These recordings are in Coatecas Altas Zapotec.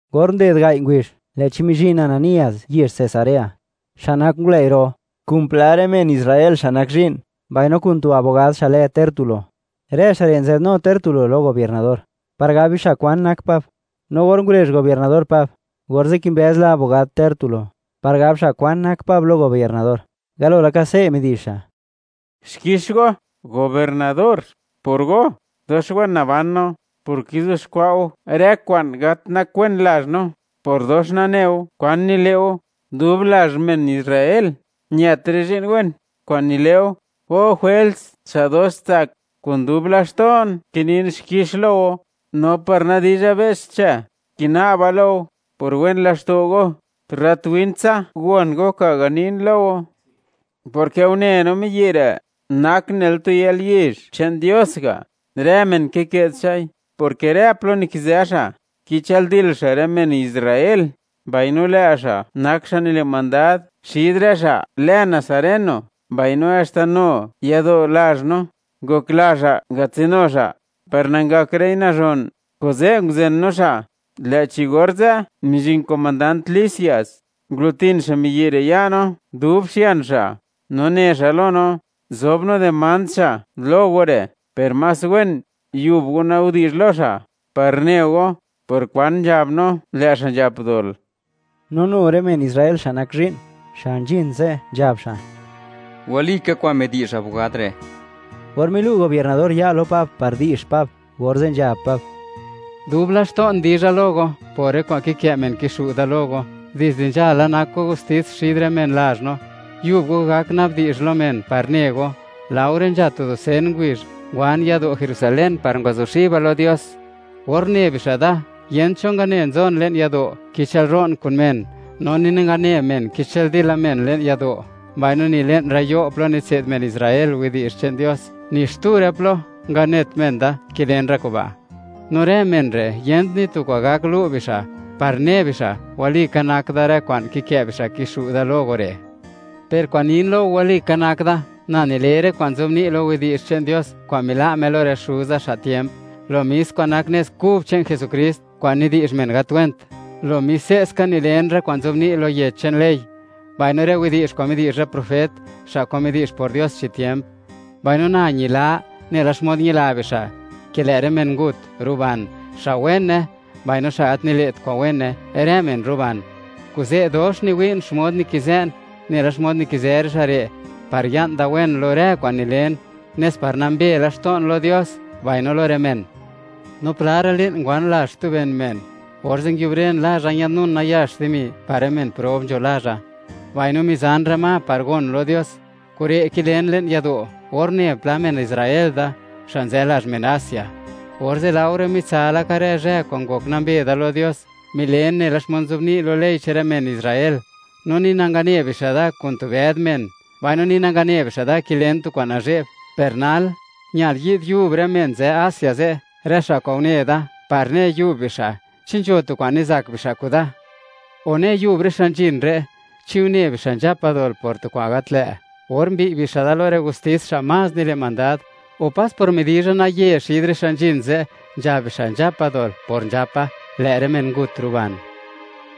Or nded gai' ngubizh, lë'chi mizhin Ananías yezh Cesarea, xa' nak ngulëi' ro, kun pla rë men Israel xa' nak zhi'n, mbaino kun tu abogad xa' lë Tértulo. Rë xa' re' nzadnu Tértulo lo gobiernador, par gab bixa' kwan nak Pab. No or ngurezh gobiernador Pab, orze' kimbëz la abogad Tértulo, par gab xa' kwan nak Pab lo gobiernador. Galo laka, se' midi'zh xa': ―Xkix go, gobiernador; por go, dox wen naban no, por kizuxkwa' go rë kwa'n gat nak wen lazh no, por dox nane go kwa'n nile' go. Dub lazh men Israel, ñët rë zhi'n wen kwa'n nile' go, O Jwels xa' dox tsak. Kun dub laxto'n, kinin xkix lo go. No par nadizha be's xche, kina'ba lo go, por wen laxto' go, tu rrat win tsa gon go kwa'n ganin lo go, porke une no miyi' re' nak nela tu yalyizh che'n Dios ga', rë men kike'd xa'i, porke rë plo nikizë xa', kichëldil xa' rë men Israel. Mbaino lë' xa' nak xa' nile' mandad xid rë xa' lë nazareno. Mbaino haxta nu yado' lazh no, ngokla xa' ngatsinu xa', par nangakra'i nazhon, kuze' nguzen no xa'. Lë'chi orze' mizhin komandant Lisias, ngulutin xa' miyi' re' ya' no, dub xian xa', no ne xa' lo no, zob no demand xa' lo go re'. Per más wen, yub go nabdi'zh lo xa', par ne go, por kwan nzhab no lë' xa' nzhap dol. No nu rë men Israel xa' nak zhi'n, xa' nzhin ze' nzhab xa': ―¡Walika kwa'n midi'zh abogad re'! Or milu' gobiernador ya' lo Pab par di'zh Pab, orze' nzhab Pab: ―Dub laxto'n dizha lo go, por rë kwa'n kikë' men kixu' da lo go, dizde nzhala, nak go gustis xid rë men lazh no. Yub go gak nabdi'zh lo men par ne go, laore nzha tu dusen ngubizh, ngwan yado' Jerusalén par ngwazuxiba lo Dios. Or une bixa' da, yent cho ngane nzon le'n yado', kichëlro'n kun men, no ni nangane men kichëldila men le'n yado', mbaino ni le'n rë yo' plo nitse'd men Israel widi'zh che'n Dios, ni xtu rë plo nganet men da, kilen rë kuba'. No rë men re', yent ni tu kwa'n gak lu' bixa', par ne bixa', walika nak da rë kwa'n kikë' bixa' kixu' da lo go re'. Per kwa'n nin lo go walika nak da, na nile rë kwa'n nzobni' lo Yech che'n Dios kwa'n mila' Me lo rë xuza xa' tiemp, lo mis kwa'n nak Nez Kub che'n Jesukrist, kwa'n nidi'zh men gat went. Lo mis se'ska nilen rë kwa'n nzobni' lo yech che'n ley, mbaino rë widi'zh kwa'n midi'zh rë profet, xa' kwa'n midi'zh por Dios chi tiemp. Mbaino na, ñila nela xmod ñila bixa', ke lë' rë men ngut ruban, xa' wene mbaino xa' gat nile't kwa'n wene; rë men ruban. Kuze', dox niwi'n xmod nikizë'n, nela xmod nikizë rë xa' re', par ya'n da wen lo rë kwa'n nilen, nes par nambe laxto'n lo Dios, mbaino lo rë men. ’No pla ra' li'n ngwan lazh xtu ben men, orze' nguiubren lazha, ñadnun nayax dimi, par rë men prob nzho lazha, mbaino mizan rë ma, par gon lo Dios. Kure' kilen le'n yado' or une pla men Israel da, xa' nzë lazh men Asia. Orze' laore mitsa laka rë zhë kwa'n ngok nambe da lo Dios, milen nela xmod nzobni' lo ley che'n rë men Israel. No ni nangane bixa' da kun tu bëd men, mbaino ni nangane bixa' da kilen tu kwa'n nazhe'b. Per nal, ñal yid yub rë men nzë Asia ze', rë xa' kwa'n une da, par ne yub bixa' chi nzho tu kwan nizak bixa' kuda. O ne yub rë xa' nzhin re', chi une bixa' nzhapa dol por tu kwa'n gat lë', or mbiy' bixa' da lo rë gustis xa' más nile' mandad. O pas por midizha naye xid rë xa' nzhin ze', nzhab bixa' nzhapa dol por nzhapa: “¡Lë' rë men ngut ruban!”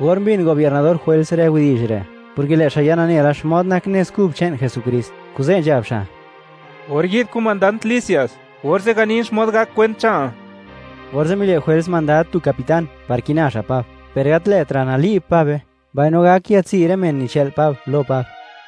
Or mbin gobiernador Jwels rë widi'zh re', porke lë' xa' ya nane la, xmod nak Nez Kub che'n Jesukrist, kuze' nzhab xa': ―Or yi'd komandant Lisias, orze' ganin xmod gak kwent che'nal. Orze' mile' Jwels mandad tu capitán, par kina xa' Pab, per gat lë'tra' nali'b Pabe, mbaino gak yatsi' rë men nichë'l Pab, lo Pab.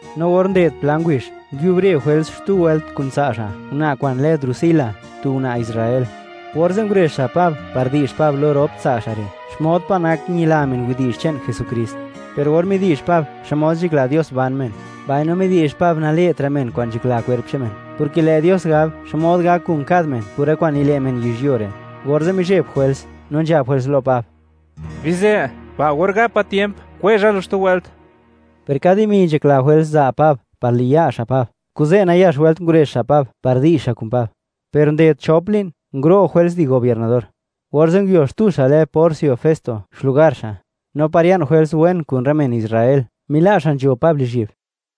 No or nded pla ngubizh, nguiubre Jwels xtu wëlt kun tsa' xa', una' kwa'n lë Drusila, tu una' Israel. Orze' ngurezh xa' Pab par di'zh Pab lo rop tsa' xa' re', xmod pa' nak ñila men widi'zh che'n Jesukrist. Per or midi'zh Pab, xmod nzhakla Dios ban men, mbaino midi'zh Pab nale'tra' men kwa'n nzhakla kwerp che'n men, porke lë' Dios gab xmod gak kun kad men por rë kwa'n nile' men yizhyuo re', orze' mizheb Jwels, no nzhab Jwels lo Pab: ―Bizë; ba' or gapa tiemp, kwezha lu xtu wëlt. Per ka dimi nzhakla Jwels za' Pab par liya' xa' Pab, kuze' nayax wëlt ngurezh xa' Pab, par di'zh xa' kun Pab. Per nded chop li'n, nguro' Jwels di gobiernador. Orze' nguio xtu xa' lë Porcio Festo xlugar xa'. No par ya'n Jwels wen kun rë men Israel, mila' xa' nzho Pab lizhyi'b.